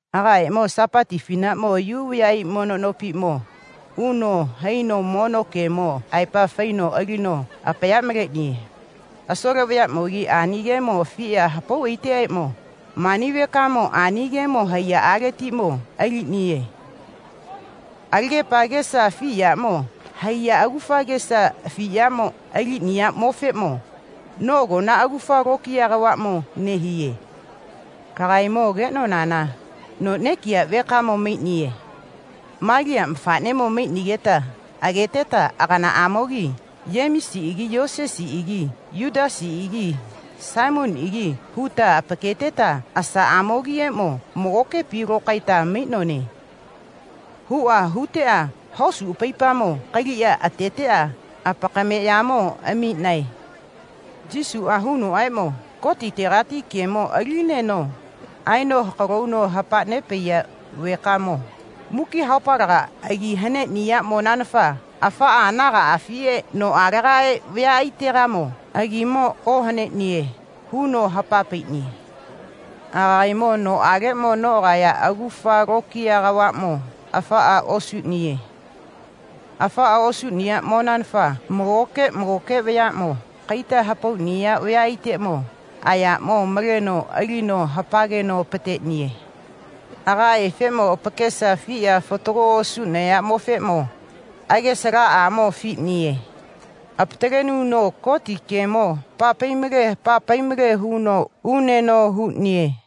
Agaemo Sapati afinaʼmo Yu vayaʼai mono nopiʼmo uno haino mono gemo aepa faino alino apaya maleʼniye. Asole vayaʼmogi ani gemo afiʼa hapau aiteʼapaeʼmo, mani vekamo ani gemo haiyaʼaletiʼmo aliʼniye. Alagepa agesa afi yaʼmo haiya agufa agesa afi yaʼmo aliʼniyaʼmofeʼmo noʼagona agufa lokiya kavaʼmo nehiye. Lagaemo ageʼnonana noʼmo nekiya vekamo maiʼniye. Maliya mafaʼnemo maiʼnigeta ageteta aganaʼamogimo Yemisiʼagi Yosesiʼagi Yutasiʼagi Saimoniʼagi huta apaketeta asaʼamogiʼeʼmo magokepi lokaeta maiʼnone, huʼa huteʼa hosu apaipamo kaliʼa ateteʼa apakameʼyamo amiʼnae. Yesuʼa hunoʼaeʼmo, Gotitegati gemo alinineno aeno hakalo huno hapa nepaiya vekamoʼmo muki haopalegamo agi haneʼniyaʼmonanafa afamo anagaʼafiʼe noʼalega vayaʼaitegaʼeʼmo agimo ohaneʼniye, huno hapa paiʼniye. Agaemo noʼaleʼmo noʼagaya agufa lokiya kavaʼmo afaʼa osuʼniye. Afaʼa osuʼniyaʼmonanafa magoke magoke vayaʼmo kaita hapauʼniya vayaʼaiteʼmo ayaʼmo maleʼneno alino hapageno apateʼniye. Agaefeʼmo apakesa afiʼa fatago osuʼnayaʼmofeʼmo agesa alaʼamo afiʼniye. Apatalenuno Goti gemo hapa pai male hapa pai male huno uneno huʼniye.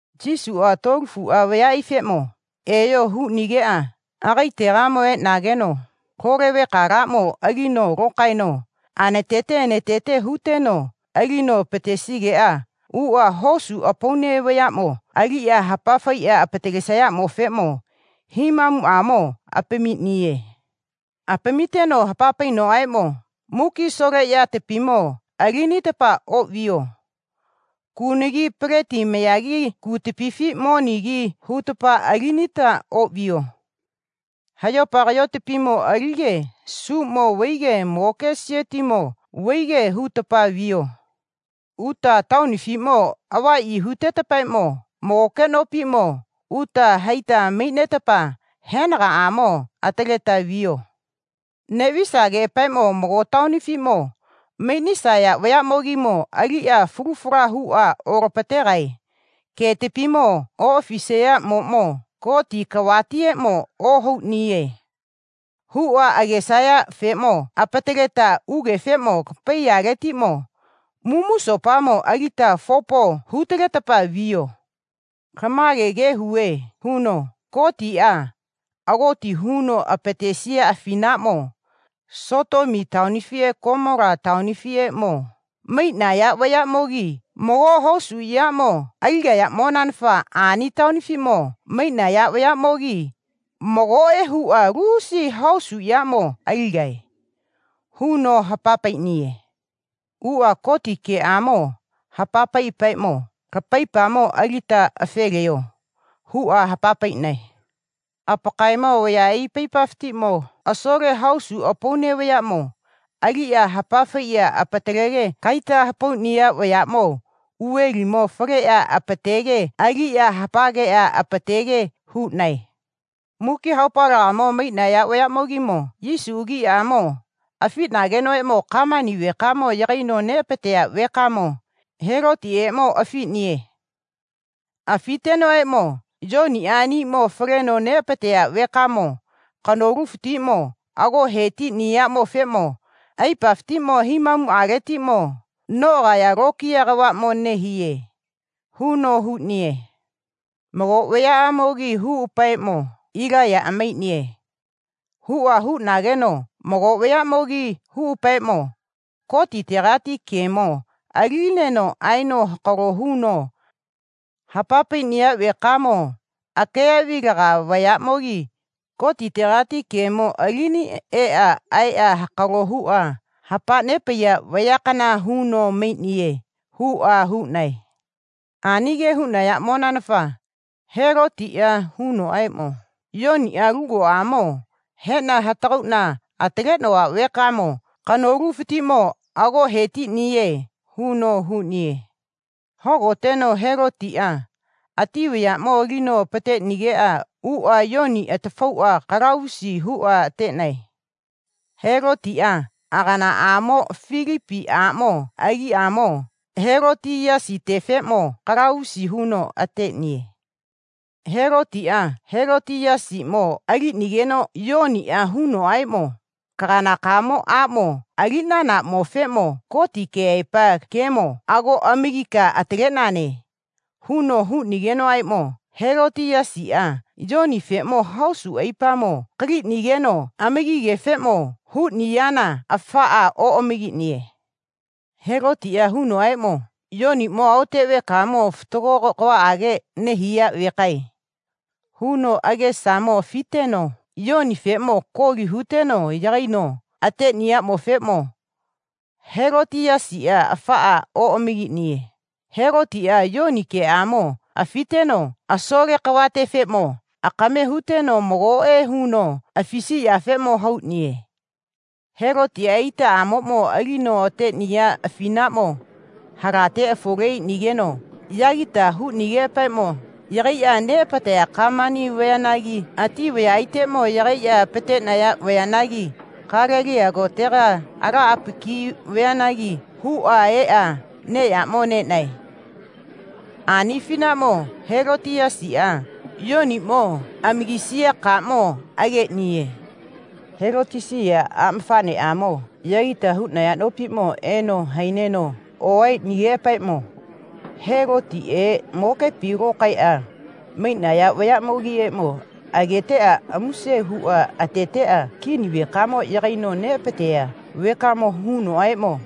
Yesuʼa tuolofuʼa vayaʼaifeʼmo, eyo, huno huʼnigeʼa agaetegamo eʼnageno lole vekalaʼmo alino lokaeno anatete anatete huteno alino apatesigeʼa uʼa hosu apaune vayaʼmo aliʼa hapafaiʼa apatalesayafeʼmo himamuʼamo apamiʼniye. Apamiteno hapa painoʼaeʼmo, muki asole yatapimo alinita oʼviyo. Kunagi peleti mayagi kutapifi monigi hutapa alinita oʼviyo. Hayopa kayotapimo alige suʼmo vaige magoke siotimo vaige hutapa viyo. Uta taonifiʼmo avaʼyi hutetapaeʼmo magoke nopiʼmo uta haita maiʼnetapa henagaʼamo ataleta viyo. Neʼvisageʼapaeʼmo mago taonifiʼmo maiʼnisaya vayaʼmogimo aliʼa falu fala huʼa olapateʼa getapimo oʼafisayaʼmoʼmo Gotiʼa kavatieʼmo ohauʼniye, huʼa agesayafeʼmo apataleta ugefeʼmo lapaiyaletiʼmo mumusopamo alita fopo hutaletapa viyo. Lama ge huve, huno, Gotiʼa agoti huno apatesiya afinaʼmo Sotomi taonifiʼe Gomola taonifiʼeʼmo maiʼnaya vayaʼmogi mago hosu yaʼmo aligayaʼmonanafa ani taonifiʼmo maiʼnaya vayaʼmogi magoʼe huʼa lusi hosu yaʼmo aligae, huno hapa paiʼniye. Uʼa Goti gemo hapa paiʼapaeʼmo, lapaipamo alita afe leyo, huʼa hapa paiʼnae. Apakaemo vayaʼai apaipafatiʼmo asole hosu apaune vayaʼmo aliʼa hapa faiʼa apatalege kaita hapauʼniya vayaʼmo uvelimo faleʼa apateteʼa aliʼa hapageʼa apatege huʼnae. Muki haopalegamo maiʼnaya vayaʼmogimo Yesu agiʼamo afiʼnagenoʼaeʼmo gamani vekamo yagaino apateʼniya vekamo Helotiʼeʼmo afiʼniye. Afitenoʼaeʼmo, Yoniʼa aniʼmo faleno neʼapateya vekamo kanolufatiʼmo ago he tiʼniyaʼmofeʼmo aipafatiʼmo himamuʼaletiʼmo noʼagaya lokiya kavaʼmo nehiye, huno huʼniye. Mago vayaʼamogi huʼapaeʼmo, Ilaiyaʼa maiʼniye, huʼa huʼnageʼa mago vayaʼamogi huʼapaeʼmo, Gotitegati gemo alinineno aeno hakalo huno hapa nepaiya vekamo akeyaʼvilaga vayaʼmogi Gotitegati gemo alini eʼa aeʼa hakalo huʼa hapa nepaiya vayakana huno maiʼniye, huʼa huʼnae. Ani ge huʼnayaʼmonanafa Helotiʼa hunoʼaeʼmo, Yoniʼa lugoʼamo heʼna hatagauʼna ataleʼnova vekamo kanolufatiʼmo ago he tiʼniye, huno huʼniye. Hogoteno Helotiʼa ati vayaʼmo alino apateʼnigeʼa uʼa Yoniʼa atafauʼa kalavusi huʼa ateʼnae. Helotiʼa aganaʼamo Filipi aʼmo agiʼamo Helotiyasitefeʼmo kalavusi huno ateʼniye. Helotiʼa Helotiyasiʼmo aliʼnigeno Yoniʼa hunoʼaeʼmo, kaganakamo aʼmo aliʼnanaʼmofeʼmo Goti keʼaepa gemo ago amagika ataleʼnane, huno huʼnigenoʼaeʼmo Helotiyasiʼa Yonifeʼmo hosu aipamo kaliʼnigeno amagigefeʼmo huʼniyana afaʼa oʼamagiʼniye. Helotiʼa hunoʼaeʼmo, Yoniʼmo aote vekamo fatago kavaʼage nehiya vekae, huno agesamo afiteno Yonifeʼmo koli huteno yagaino ateʼniyaʼmofeʼmo Helotiyasiʼa afaʼa oʼamagiʼniye. Helotiʼa Yoni geʼamo afiteno asole kavatefeʼmo akame huteno magoʼe huno afisiyafeʼmo hauʼniye. Helotiʼa itaʼamoʼmo alino ateʼniya afinaʼmo halate afole aiʼnigeno yagita huʼnigeʼapaeʼmo yagaiʼa apateʼnaya gamani vayanagi ati vayaʼaiteʼmo yagaiʼa apateʼnaya vayanagi Galeliya kotega ala apaki vayanagi huʼa eʼa neʼyaʼmo neʼnae. Ani afinaʼmo Helotiyasiʼa Yoniʼmo amagisiya kaʼmo ageʼniye. Helotiyasiʼa aʼmafaʼneʼamoʼmo yagita huʼnaya nopiʼmo eno haineno oaeʼnigeʼapaeʼmo Helotiʼe magokepi lokaeʼa maiʼnaya vayaʼmogiʼeʼmo ageteʼa amuse huʼa ateteʼa kini vekamo yagaino neʼapateya vekamoʼmo hunoʼaeʼmo,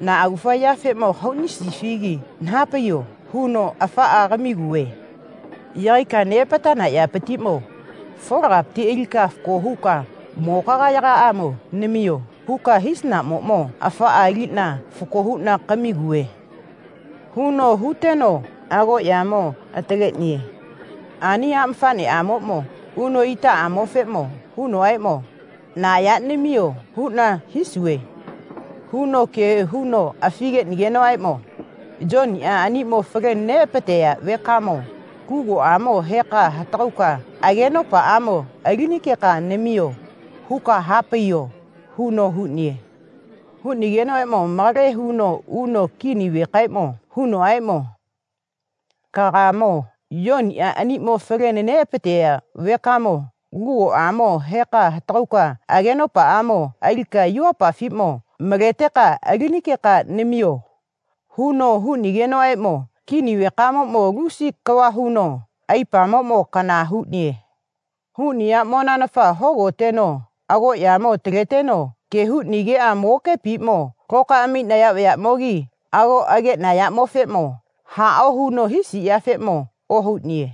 na agufa yafeʼmo kahauʼnisifigi naha paiyo, huno, afaʼa kamiguve. Yagaika apateʼnana yapatiʼmo folagapati alika fako huka magokayagaʼamo namiyo, huka hisanaʼmoʼmo afaʼa aliʼna fako huʼna kamiguve, huno huteno agoʼyamo ataleʼniye. Ani aʼmafaʼnemoʼmo uno itaʼamofeʼmo hunoʼaeʼmo, na yaʼmo namiyo, huʼna hisuve, huno ge huno afi geʼnigenoʼaeʼmo, Yoniʼa aniʼmo faleno neʼapateya vekamo lugoʼamo heka hatagauka agenopaʼamo alinikeka namiyo, huka ha paiyo, huno huʼniye. Huʼnigenoʼaeʼmo malage huno uno kini vekaeʼmo hunoʼaeʼmo, kagaemo Yoniʼa aniʼmo faleno neʼapateya vekamo lugoʼamo heka hatagauka agenopaʼamo alika yuvapafiʼmo maleteka alinikeka namiyo, huno huʼnigenoʼaeʼmo kini vekamoʼmo lusi kava huno aipamoʼmo kana huʼniye. Huʼniyaʼmonanafa hogoteno agoʼyamo ataleteno ge huʼnigeʼa magokepiʼmo lokaeʼa maiʼnaya vayaʼmogimo ago ageʼnayaʼmofeʼmo haʼao huno hisiyafeʼmo ohauʼniye.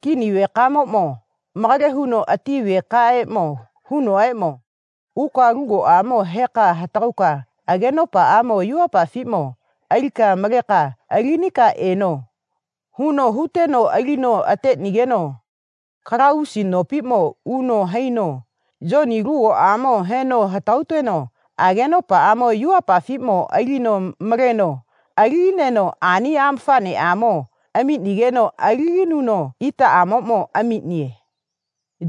Kini vekamoʼmo malage huno ati vekaeʼmo hunoʼaeʼmo, uka lugoʼamo heka hatagauka agenopaʼamo yuvapafiʼmo alika maleka alinika eno, huno huteno alino ateʼnigeno kalavusi nopiʼmo uno haino Yoni lugoʼamo heno hatagauno agenopaʼamo yuvapafiʼmo alino maleno alinineno ani aʼmafaʼnemo amiʼnigeno alininuno itaʼamoʼmo amiʼniye.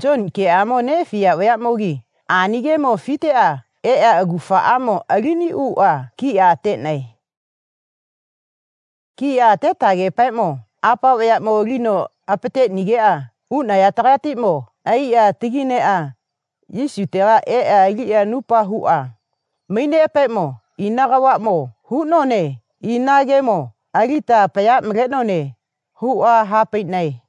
Yoni geʼamo neʼafiya vayaʼmogi ani gemo afiteʼa eʼa agufaʼamo aliniʼuʼa kiʼa ateʼnae. Kiʼa atetageʼapaeʼmo apa vayaʼmo alino apateʼnigeʼa uʼnayategatiʼmo aiʼa atagi neʼa Yesutega eʼa aliʼa anupa huʼa maiʼneʼapaeʼmo ina kavaʼmo huʼnone ina gemo alita apaya maleʼnone, huʼa ha paiʼnae.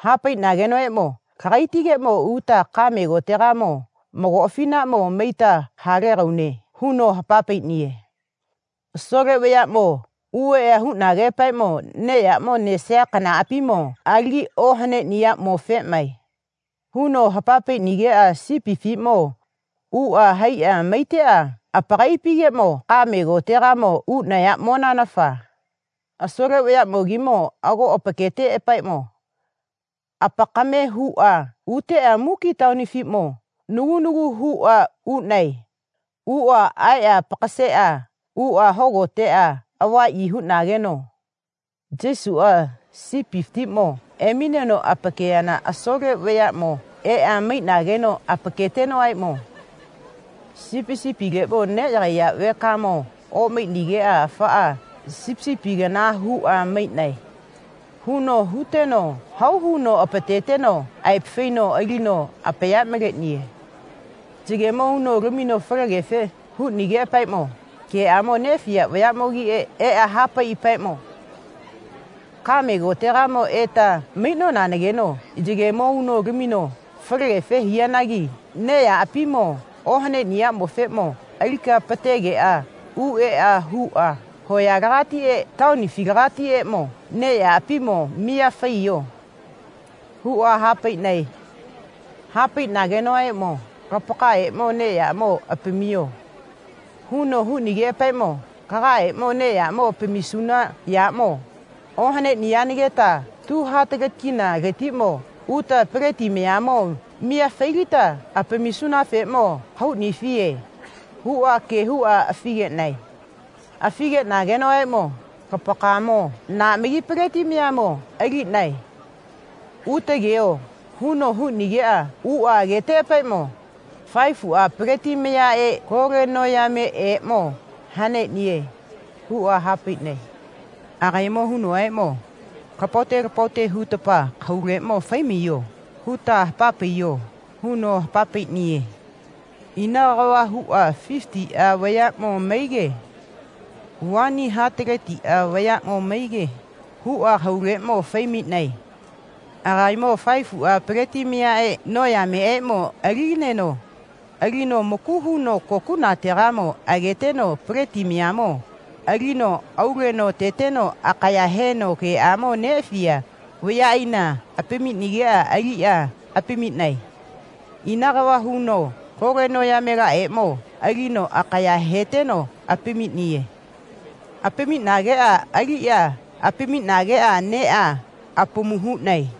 Ha paiʼnagenoʼaeʼmo, lagaitigeʼmo uta kaʼme kotega mago afinaʼmo maita haga legaune, huno hapa paiʼniye. Asole vayaʼmo uʼeʼa huʼnageʼapaeʼmo neʼyaʼmo nesaya kanaʼapimo alagi ohaneʼniyaʼmofeʼmae. Huno hapa paiʼnigeʼa sipifiʼmo uʼa haiʼa maiteʼa apakaiʼapigeʼmo kaʼme kotegamo uʼnayaʼmonanafa asole vayaʼmogi ago apaketeʼapaeʼmo, apakaemae, huʼa huteʼa muki taonifatiʼmo nagu nagu huʼa uʼnae. Uʼa aeʼa apaka seʼa uʼa hogoteʼa avaʼyi huʼnageno Yesuʼa sipifatiʼmo emineno apakeyana asole vayaʼmo eʼa maiʼnageno apaketenoʼaeʼmo, sipisipile neʼyagaiya vekamo oʼmaiʼnigeʼa afa sipisipigana huʼa maiʼnae, huno huteno hau huno apateteno aepa faino alino apaya maleʼniye. Yegemo uno lamino falegefe huʼnigeʼapaeʼmo geʼamo neʼafiya vayaʼmogi eʼa ha paiʼapaeʼmo, kaʼme kotegamo eta maiʼnonageno yegemo uno lamino falegefe hiyanagi neʼyaʼapimo ohaneʼniyaʼmofeʼmo alika apategeʼa u eʼa huʼa hoyalegatiʼe taonifilagatiʼeʼmo neʼyaʼapimo miya faiyo, huʼa ha paiʼnae. Ha paiʼnagenoʼaeʼmo, lapakaemo neʼyaʼmo apamiyo, huno huʼnigeʼapaeʼmo, lagaemo neʼyaʼmo apamisuna yaʼmo ohaneʼniyanageta tu hataleti kinaletiʼmo uta peleti mayamo miya failiteta apamisunafeʼmo kahauʼnifiye, huʼa ge huʼa afi geʼnae. Afi geʼnagenoʼaeʼmo, Lapakaemo na magi peleti mayamo aliʼnae. Uta ageyo, huno huʼnigeʼa uʼa ageteʼapaeʼmo faefuʼa peleti mayaʼe lole noyameʼeʼmo haneʼniye, huʼa ha paiʼnae. Agaemo hunoʼaeʼmo, lapaote lapaote hutapa kahauleʼmo fai maiyo, huta hapa paiyo, huno hapa paiʼniye. Ina kava huʼa fifitiʼa vayaʼmo maige vani hataletiʼa vayaʼmo maige huʼa kahauleʼmo fai maiʼnae. Agaemo faefuʼa peleti mayaʼe lole noyamelaʼeʼmo aliʼneno alino maku huno kokuʼnategamo ageteno peleti mayamo alino auleno ateteno akaya heteno geʼamo neʼafiya vayaʼaina apamiʼnigeʼa aliʼa apamiʼnae. Ina kava huno lole noyamelaʼeʼmo alino akaya heteno apamiʼniye. Apamiʼnigeʼa aliʼa apamiʼnageʼa neʼa apamu huʼnae.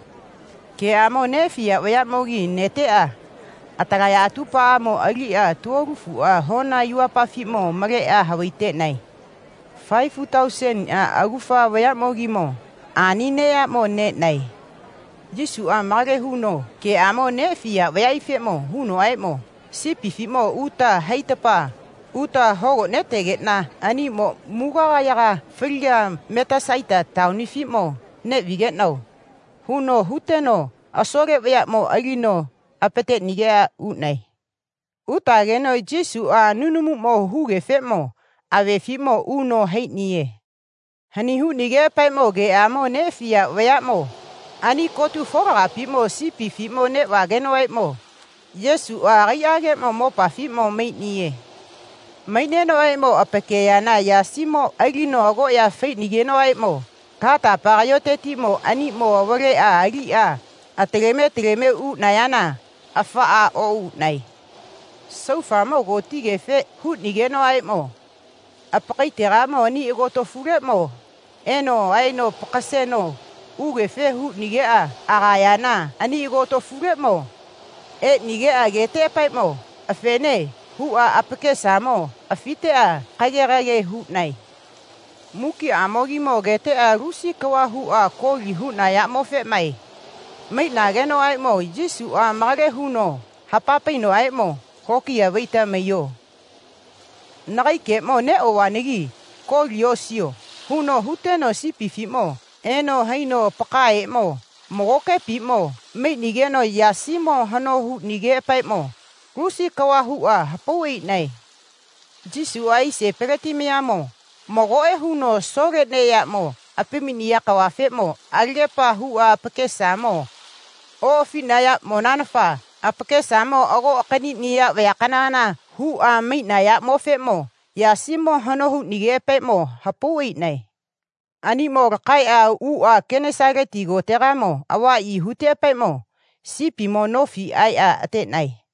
Geʼamo neʼafiya vayaʼmogi neteʼa atalaya atupaʼamo aliʼa tuolofuʼa hona yuvapafiʼmo maleʼa havai teʼnae. Faefu tauseniʼa agufa vayaʼmogimo ani neʼyaʼmo neʼnae. Yesuʼa malage huno geʼamo neʼafiya vayaʼaifeʼmo hunoʼaeʼmo, sipifiʼmo uta haitetapa uta hogoteta aniʼmo mugagayaga faliga Metasaita taonifiʼmo neʼvigeʼnao, huno huteno asole vayaʼmo alino apateʼnigeʼa uʼnae. Utageno Yesuʼa nunumuʼmo hugefeʼmo avefiʼmo uno haiʼniye. Hani huʼnigeʼapaeʼmo geʼamo neʼafiya vayaʼmo ani kotu folagapiʼmo sipifi neʼvagenoʼaeʼmo Yesuʼa agaiʼageʼmo mopafiʼmo maiʼniye. Maiʼnenoʼaeʼmo apakeyana yasimoʼmo alino agoʼya faiʼnigeʼapaeʼmo latapa kayotetiʼmo aniʼmo avaleʼa aliʼa ataleme ataleme uʼnayana afaʼa oʼuʼnae. Saufamo kotigefe huʼnigenoʼaeʼmo apakaetegamo ani agotofuleʼmo eno aeno apaka seno ugefe huʼnigeʼa agayana ani agotofuleʼmo eʼnigeʼa ageteʼapaeʼmo, afene, huʼa apakesamo afiteʼa kage kage huʼnae. Mukiʼamogimo ageteʼa lusi kava huʼa koli huʼnayaʼmofeʼmae. Maiʼnagenoʼaeʼmo Yesuʼa malage huno hapa painoʼaeʼmo, lokiya vaita maiyo. Nagaemo neʼovanagi koli osiyo, huno huteno sipifiʼmo eno haino apakaeʼeʼmo magokepi maiʼnigeno yasimo hano huʼnigeʼapaeʼmo lusi kava huʼa hapau aiʼnae. Yesuʼa aise peleti mayafatiʼmo magoʼe huno asole neʼyaʼmo apamiʼniya kavafeʼmo alagepa huʼa apakesamo oʼafiʼnayaʼmonanafa apakesamo ago akaniʼniya vayakana huʼa maiʼnayaʼmofeʼmo yasimo hano huʼnigeʼapaeʼmo hapau aiʼnae. Aniʼmo lakaeʼuʼa Genesaleti kotegamo avaʼyi huteʼapaeʼmo sipimo nofi aeʼa ateʼnae.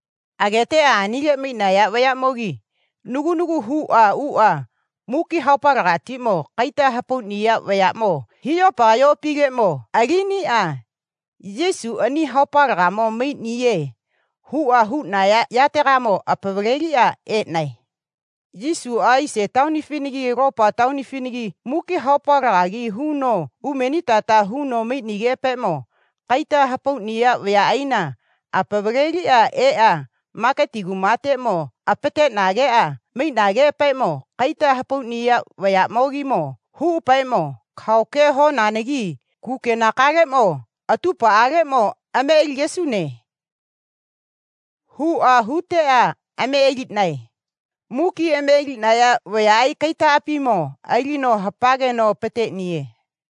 Ageteʼa anile maiʼnaya vayaʼmo nagu nagu huʼa uʼa muki haopalegatiʼmo kaita hapauʼniya vayaʼmo hiʼyopa kayoʼapileʼmo aliniʼa Yesuʼa ani haopalegamo maiʼniye, huʼa huʼnaya yategamo apavaleliʼa eʼnae. Yesuʼa aise taonifinagi alopa taonifinagi muki haopalegagi huno umenitata huno maiʼnigeʼapaeʼmo kaita hapauʼniya vayaʼaina apavaleliʼeʼa maketi kumateʼmo apateʼnageʼa maiʼneʼapaeʼmo kaita hapauʼniya vayaʼmogimo huʼapaeʼmo, kahao ke honanagi kukenakamo atupaʼaleʼmo ame aligesune, huʼa huteʼa ame aliʼnae. Muki ame aliʼnaya vayaʼai kaitaʼapimo alino hapageno apateʼniye.